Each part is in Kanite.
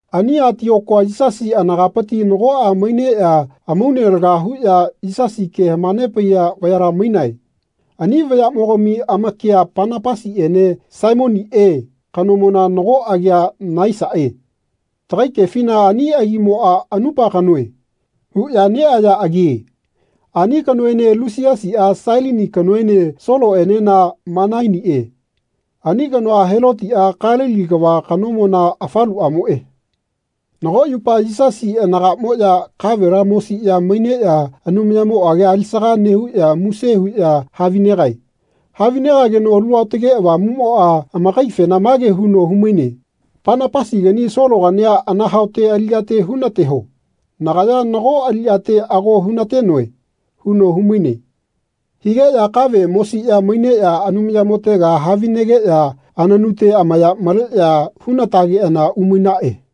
Ani Atiokua Yisasi anagapiti nagoꞌa maineꞌya amaune laga huꞌya Yisasi ke hamanepaiya vayala mainae. Ani vayaꞌmogami amakia Panapasiꞌene Simioniꞌe kanomona nago agia Naisaꞌe. Tagai kefina ani agimoꞌa “Anupa kanoe.” huꞌya neꞌaya agie. Ani kanoene Lusiasiꞌa Sailini kanoene Soloꞌenena Manainiꞌe. Ani kanoa Helotiꞌa Kalili kava kanomona afaluꞌamoꞌe. Nago yupa Yisasi anagaꞌmoꞌya kavela mosiꞌya maineꞌya Anumayamo agia alisaga nehuꞌya muse huꞌya havinegae. Havinegageno Alu Aotage Avamuꞌmoꞌa amakaifena mage huno humaine “Panapasigani Sologania anahaote aliꞌyate hunateho. Nagaya nago aliꞌyate ago hunatenoe.” huno humaine. Higeꞌya kave mosiꞌya maineꞌya Anumayamotega havinegeꞌya ananute amaya maleꞌya hunatageꞌana umainaꞌe.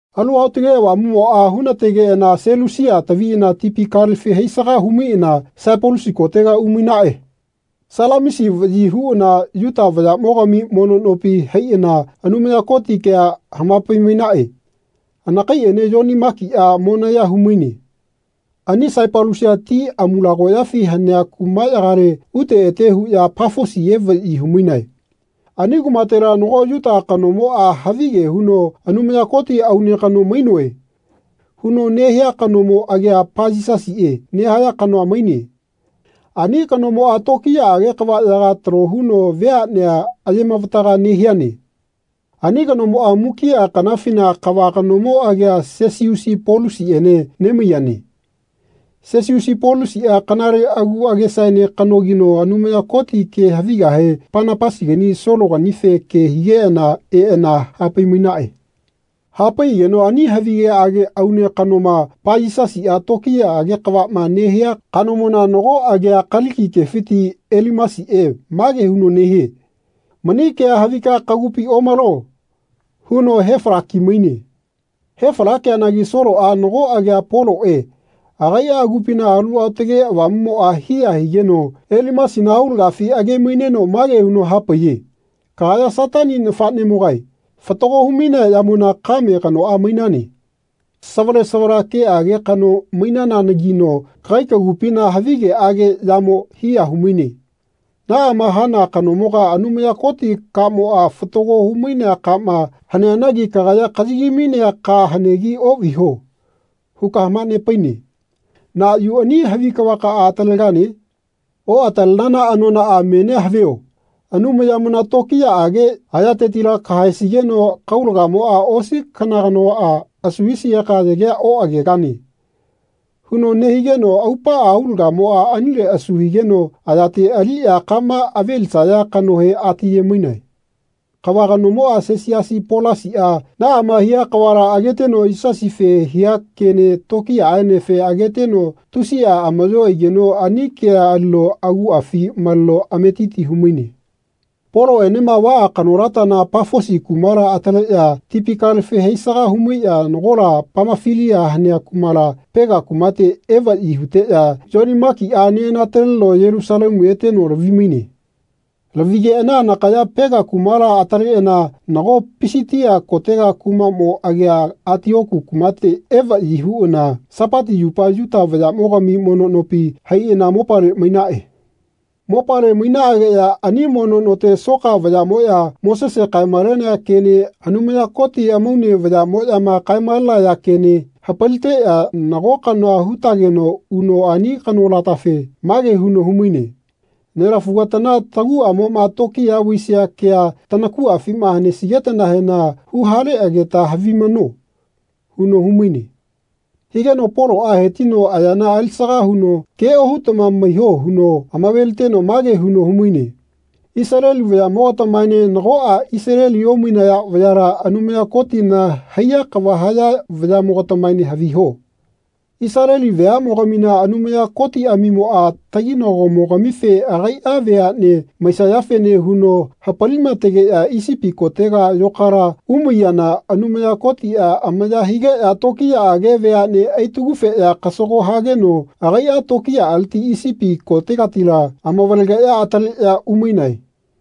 Alu Aotage Avamuꞌmoꞌa hunategeꞌana Selusia taviꞌana tipi kalefi haisaga humaiꞌana Saipalusi kotega umainaꞌe. Salamisi vaꞌyi huꞌana Yuta vayaꞌmogami mono nopi haiꞌana Anumaya Koti kea hamapai-mainaꞌe. Anakaiꞌene Yoni Makiꞌa monaya humaine. Ani Saipalusia ti amulagoyafi hanea kumaꞌyagale ute ete huꞌya Pafosi evaꞌyi humainae. Ani kumatela nago Yuta kanomoꞌa havige huno “Anumaya Koti aune kano mainoe.” huno nehia kanomo agia Payisasiꞌe nehaya kanoa maine. Ani kanomoꞌa tokiyaꞌage kavaꞌyaga talo huno veaꞌnea ayemavataga nehiane. Ani kanomoꞌa mukiꞌa kanafina kava kanomo agia Sesiusi Polusiꞌene nemaiyane. Sesiusi Polusiꞌa kanale agu agesaene kanogino Anumaya Koti ke havigahe Panapasigani Sologanife ke higeꞌana eꞌana hapai-mainaꞌe. Hapaiꞌageno ani havigeꞌage aune kanoma Payisasiꞌa tokiyaꞌage kavaꞌma nehia kanomona nago agia Kaliki kefiti Elimasiꞌe mage huno nehie “Mani kea havika kagupi omalo.” huno hefalaki-maine. Hefalakeanagi Soloꞌa nago agia Poloꞌe agaiꞌa agupina Alu Aotage Avamuꞌmoꞌa hiya higeno Elimasina aulagafi age-maineno mage huno hapaiye “Kagaya Satani nafaꞌnemogae fatago humainea yamona kame kanoꞌa mainane. Savale savala keꞌage kano mainananagino kagai kagupina havi keꞌage yamoꞌa hiya humaine. Naꞌama hana kanomoga Anumaya Koti kamoꞌa fatago humainea kama haneanagi kagaya ‘Kayagimainea ka hanegi oꞌviho.’ huka hamanepaine. Na yu ani havi kavakaꞌa atalegane? Oꞌatalenana anonaꞌa menia havio Anumayamona tokiyaꞌage ayatetila kahaesigeno kaulagamoꞌa osi kanaganoꞌa asu hisigeka yagea oꞌagegane.” huno nehigeno aupaꞌa aulagamoꞌa anile asu higeno ayate aliꞌya kama avelisaya kanohe atiye-maine. Kava kanomoꞌa Sesiasi Polasiꞌa naꞌama hia kavala ageteno Yisasife hia kene tokiyaꞌaenefe ageteno tusiꞌa amaꞌyo aigeno ani kea alino aguꞌafi maleno ametiti humaine. Poloꞌenema vaꞌa kanolatana Pafosi kumala ataleꞌya tipi kalefi haisaga humaiꞌya nagola Pamafilia hanea kumala Pega kumate evaꞌyi huteꞌya Yoni Makiꞌa neꞌanataleno Yelusalemu eteno lavi-maine. Lavigeꞌana anakaya Pega kumala ataleꞌana nago Pisitia kotega kumaꞌmo agia Atioku kumate evaꞌyi huꞌana Sapati yupa Yuta vayaꞌmogami mono nopi haiꞌana mopale mainaꞌe. Mopale mainaꞌageꞌya ani mono note soka vayaꞌmoꞌya Mosese kae-malenea kene Anumaya Koti amaune vayaꞌmoꞌyama kae-malenaya kene hapaliteꞌya nago kanoa hutageno uno ani kanolatafe mage huno humaine “Nelafugatana taguꞌamoꞌma tokiya vaisia kea tanakuꞌafima hanesigetanahena huhaleꞌageta havimano.” huno humaine. Higeno Poloꞌa hetino ayana alisaga huno ke ohutama maiho huno amaveliteno mage huno humaine ‘Isaleli vayaꞌmogatamaene nagoꞌa Isaleli omainaya vayala Anumaya Kotina haiya kava haya vayaꞌmogatamaene haviho. Isaleli veaꞌmogamina Anumaya Kotiꞌamimoꞌa taginagomogamife agaiꞌa veaꞌne maisayafene huno hapalimategeꞌya Isipi kotega yokala umaiyana Anumaya Kotiꞌa amaya higeꞌya tokiyaꞌage veaꞌne aitagufeꞌya kasago hageno agaiꞌa tokiyaꞌaleti Isipi kotegatila amavalegeꞌya ataleꞌya umainae.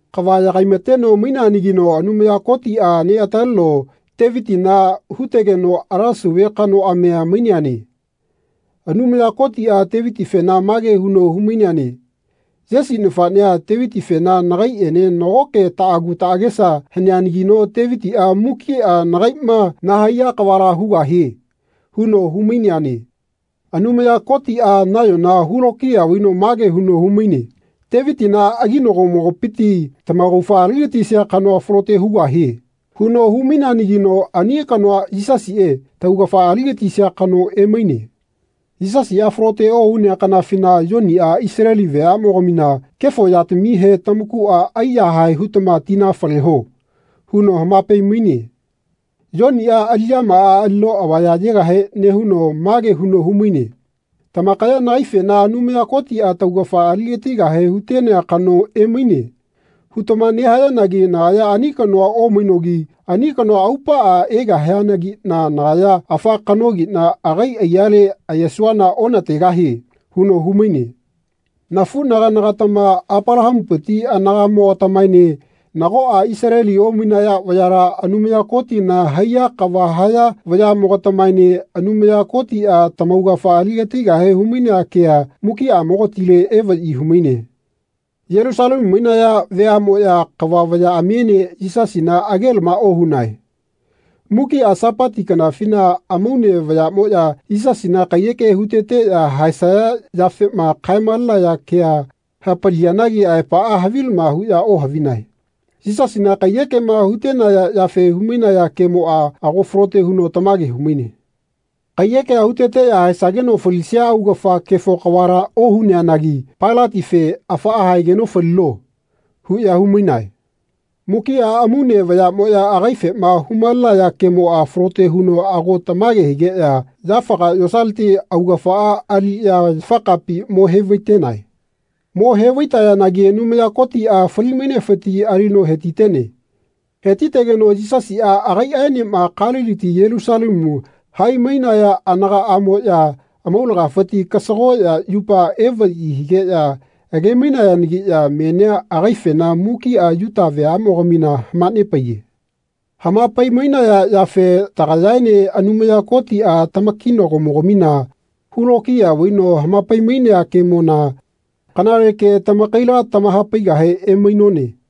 Kava yagaimateno maineanagino Anumaya Kotiꞌa neꞌataleno Tevitina hutegeno ala sauve kanoꞌamia maineane. Anumaya Kotiꞌa Tevitifena mage huno humaineane “Yesi nafaꞌnea Tevitifena nagaiꞌene nagoke taꞌagu taꞌagesa haneanagino Tevitiꞌa mukiꞌa nagaiꞌma nahaiya kavala hugahie.” huno humaineane. Anumaya Kotiꞌa nayona hulokiya vaino mage huno humaine “Tevitina aginagomopiti tamaugafa aligatisia kanoa falote hugahie.” huno humaineanagino ani kanoa Yisasiꞌe taugafa aligatisia kano emaine. Yisasiꞌa falote ohunea kanafina Yoniꞌa Isaleli veaꞌmogamina “Kefo yatamihe tamakuꞌa aiyahae hutama tina faleho.” huno hamapai-maine. Yoniꞌa aliꞌyamaꞌa alino avaya ayegahe nehuno mage huno humaine “Tamakaya nagaifena ‘Anumaya Kotiꞌa taugafa aligatigahe hutenea kano emaine.’ hutama nehayanagi nagaya ani kanoa omainogi ani kanoa aupaꞌa egahianagiꞌna nagaya afa kanogiꞌna agai aiyale ayesuana onategahie.” huno humaine. Nafu-naganagatama Apalahamupiti anagaꞌmogatamaene nagoꞌa Isaleli omainaya vayala Anumaya Kotina haiya kava haya vayaꞌmogatamaene Anumaya Kotiꞌa tamaugafa aligatigahe humainea kea mukiꞌamogatile evaꞌyi humaine. Yelusalemu mainaya veaꞌmoꞌya kava vayaꞌamiene Yisasina agelama ohunae. Mukiꞌa sapati kanafina amaune vayaꞌmoꞌya Yisasina kaiyeke huteteꞌya haesaya yafema kae-malenaya kea hapaliyanagi aepaꞌa havilama huꞌya ohavinae. Yisasina kaiyekema hutenaya yafe humainaya kemoꞌa ago falote huno tamage humaine. Kaiyekea huteteꞌya haesageno falisia augafa kefo kavala ohuneanagi Pailatife “Afaꞌa haegeno falino.” huꞌya humainae. Mukiꞌa amaune vayaꞌmoꞌya agaifema humalenaya kemoꞌa falote huno ago tamage higeꞌya yafaga yosaleti augafaꞌa aliꞌya yafakapi mo-hevaitenae. Mo hevaitayanagi Anumaya Kotiꞌa fali-mainefiti alino hetitene. Hetitegeno Yisasiꞌa agaiꞌaenema Kaliliti Yelusalemu hai-mainaya anagaꞌamoꞌya amaulagafiti kasagoꞌya yupa evaꞌyi higeꞌya age-mainayanagiꞌya menia agaifena mukiꞌa Yuta veaꞌmogamina hamanepaiye. Hamapai-mainaya yafe tagayaene Anumaya Kotiꞌa tamakinago-mogamina hulokiya vaino hamapai-mainea kemona kanale ke tamakaila tamahapaigahe emainone.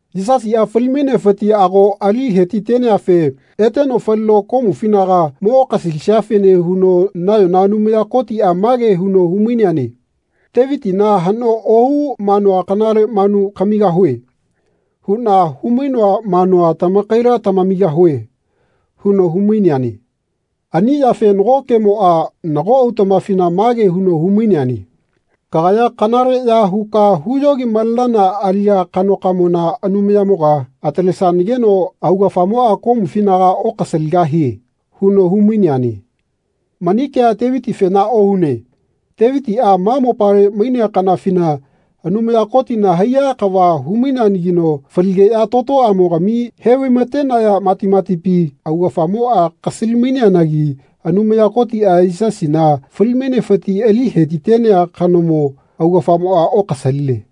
Yisasiꞌa fali-mainefiti ago ali hetiteneafe eteno falino komufinaga mo okasalisiafene huno nayona Anumaya Kotiꞌa mage huno humaineane “Tevitina ‘Haꞌno ohu manua kanale manu kamigahue.’ huꞌna humainoa manua tamakaila tamamigahue” huno humaineane. Ani yafe nago kemoꞌa nago autaꞌmafina mage huno hu-maineane “Kagaya kanaleꞌya huka huyogi-malenana aliꞌya kanokamona Anumayamoga atalesanageno augafamoꞌa komufinaga okasaligahie.” huno humaineane. Mani kea Tevitifena ohune. Tevitiꞌa ma mopale mainea kanafina Anumaya Kotina haiya kava humaineanagino faligeꞌya totoꞌamogami hevaimatenaya matimatipi augafamoꞌa kasali-maineanagi Anumaya Kotiꞌa Yisasina fali-mainefiti ali hetitenea kanomo augafamoꞌa okasaline.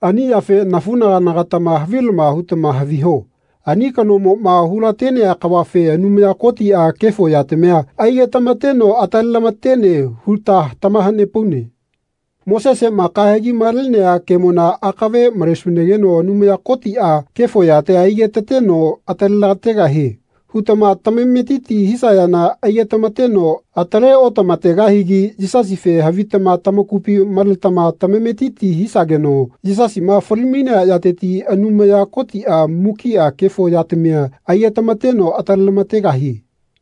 Ani yafe nafuꞌnaganagatama havilama hutama haviho ani kanomoꞌma hulatenea kavafe Anumaya Kotiꞌa kefo yatamia aigetamateno atalelamatene huta tamahanepaune. Moseseꞌma kahegi malenea kemona akave malesunageno Anumaya Kotiꞌa kefo yatia aigetateno atalelategahie hutama tamametiti hisayana aigetamateno ataleotamategahigi Yisasife havitama tamakupi maletama tamametiti hisageno Yisasiꞌma fali-mainea yateti Anumaya Kotiꞌa mukiꞌa kefo yatamia aigetamateno atale-lamategahie.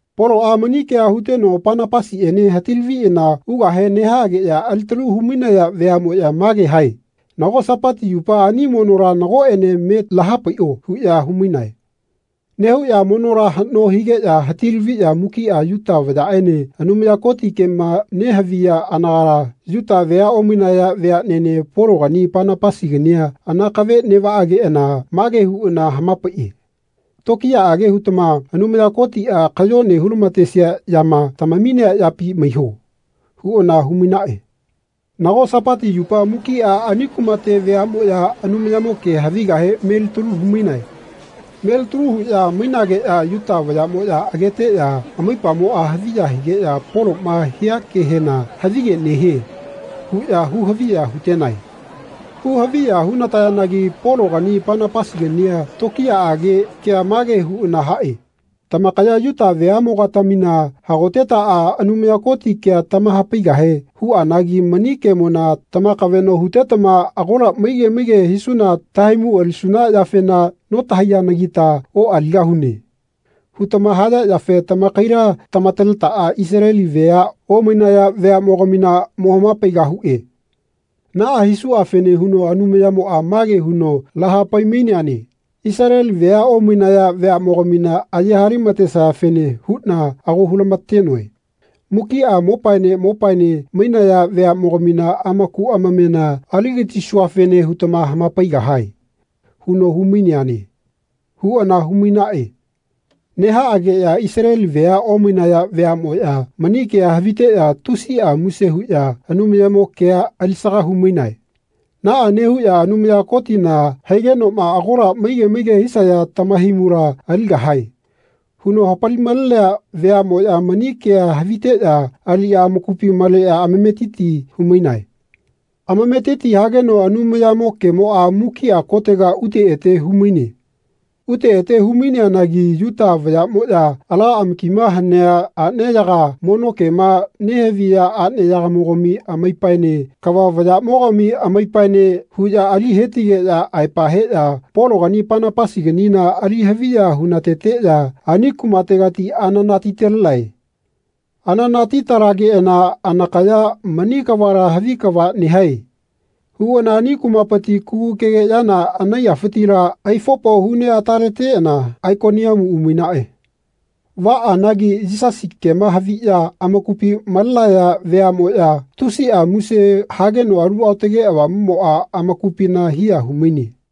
Poloꞌa mani kea huteno Panapasiꞌene hati-laviꞌana ugahe nehaꞌageꞌya alitalu humainaya veaꞌmoꞌya mage hae “Nago Sapati yupa ani monola nagoꞌene me lahapaiꞌo.” huꞌya humainae. Nehuꞌya monola haꞌno higeꞌya hati-laviꞌya mukiꞌa Yuta vayaꞌene Anumaya Koti kema nehaviya anagala Yuta vea omainaya veaꞌnene Pologani Panapasigania anakave neꞌvageꞌana mage huꞌana hamapaiꞌe “Tokiyaꞌage hutama Anumaya Kotiꞌa kayone hulamatesia yama tamaminea yapi maiho.” huꞌana humainaꞌe. Nago Sapati yupa mukiꞌa ani kumate veaꞌmoꞌya Anumayamo ke havigahe melitalu humainae. Melitalu huꞌya mainageꞌya Yuta vayaꞌmoꞌya ageteꞌya amaipamoꞌa haviya higeꞌya Poloꞌma hia kehena “Havige nehie.” huꞌya hu-haviya hutenae. Hu-haviya hunatayanagi Pologani Panapasigania tokiyaꞌage kea mage huꞌana haꞌe “Tamakaya Yuta veaꞌmogatamina hagotetaꞌa Anumaya Koti kea tamahapaigahe huꞌanagi mani kemona tamakaveꞌno hutetama ‘Agola maige maige hisuna tahaimu alisuna yafena notahaiyanagita oꞌaligahune.’ hutama haya yafe tamakaila tamataletaꞌa Isaleli vea omainaya veaꞌmogamina mo-hama-paigahuꞌe. Naꞌa hisuꞌafene huno Anumayamoꞌa mage huno lahapai-maineane ‘Isaleli vea omainaya veaꞌmogamina aye-halematesayafene huꞌna ago hulamatenoe. Mukiꞌa mopaene mopaene mainaya veaꞌmogamina amaku amamena aligatisuafene hutama hamapaigahae.’ huno humaineane.” huꞌana humainaꞌe. Nehaꞌageꞌya Isaleli vea omainaya veaꞌmoꞌya mani kea haviteꞌya tusiꞌa muse huꞌya Anumayamo kea alisaga humainae. Naꞌa nehuꞌya Anumaya Kotina haigenoꞌma “Agola maige maige hisaya tamahaimula aligahae.” huno hapali-malenea veaꞌmoꞌya mani kea haviteꞌya aliꞌya amakupi maleꞌya amametiti humainae. Amametiti hageno Anumayamo kemoꞌa mukiꞌa kotega ute ete humaine. Ute ete humaineanagi Yuta vayaꞌmoꞌya ala amakima hanea aꞌneyaga mono kema nehaviya aꞌneyagamogami amaipaene kava vayaꞌmogami amaipaene huꞌya ali hetigeꞌya aepa heꞌya Pologani Panapasiganina ali haviya-hunateteꞌya ani kumategati ananati-talenae. Ananati-talageꞌana anakaya “Mani kavala havi kava nehae.” huꞌana ani kumapiti kugukege yana anaiyafitila aifopo huneꞌataleteꞌana Aikoniamu umainaꞌe. Vaꞌanagi Yisasi kema haviꞌya amakupi malenaya veaꞌmoꞌya tusiꞌa muse hageno Alu Aotage Avamuꞌmoꞌa amakupina hiya humaine.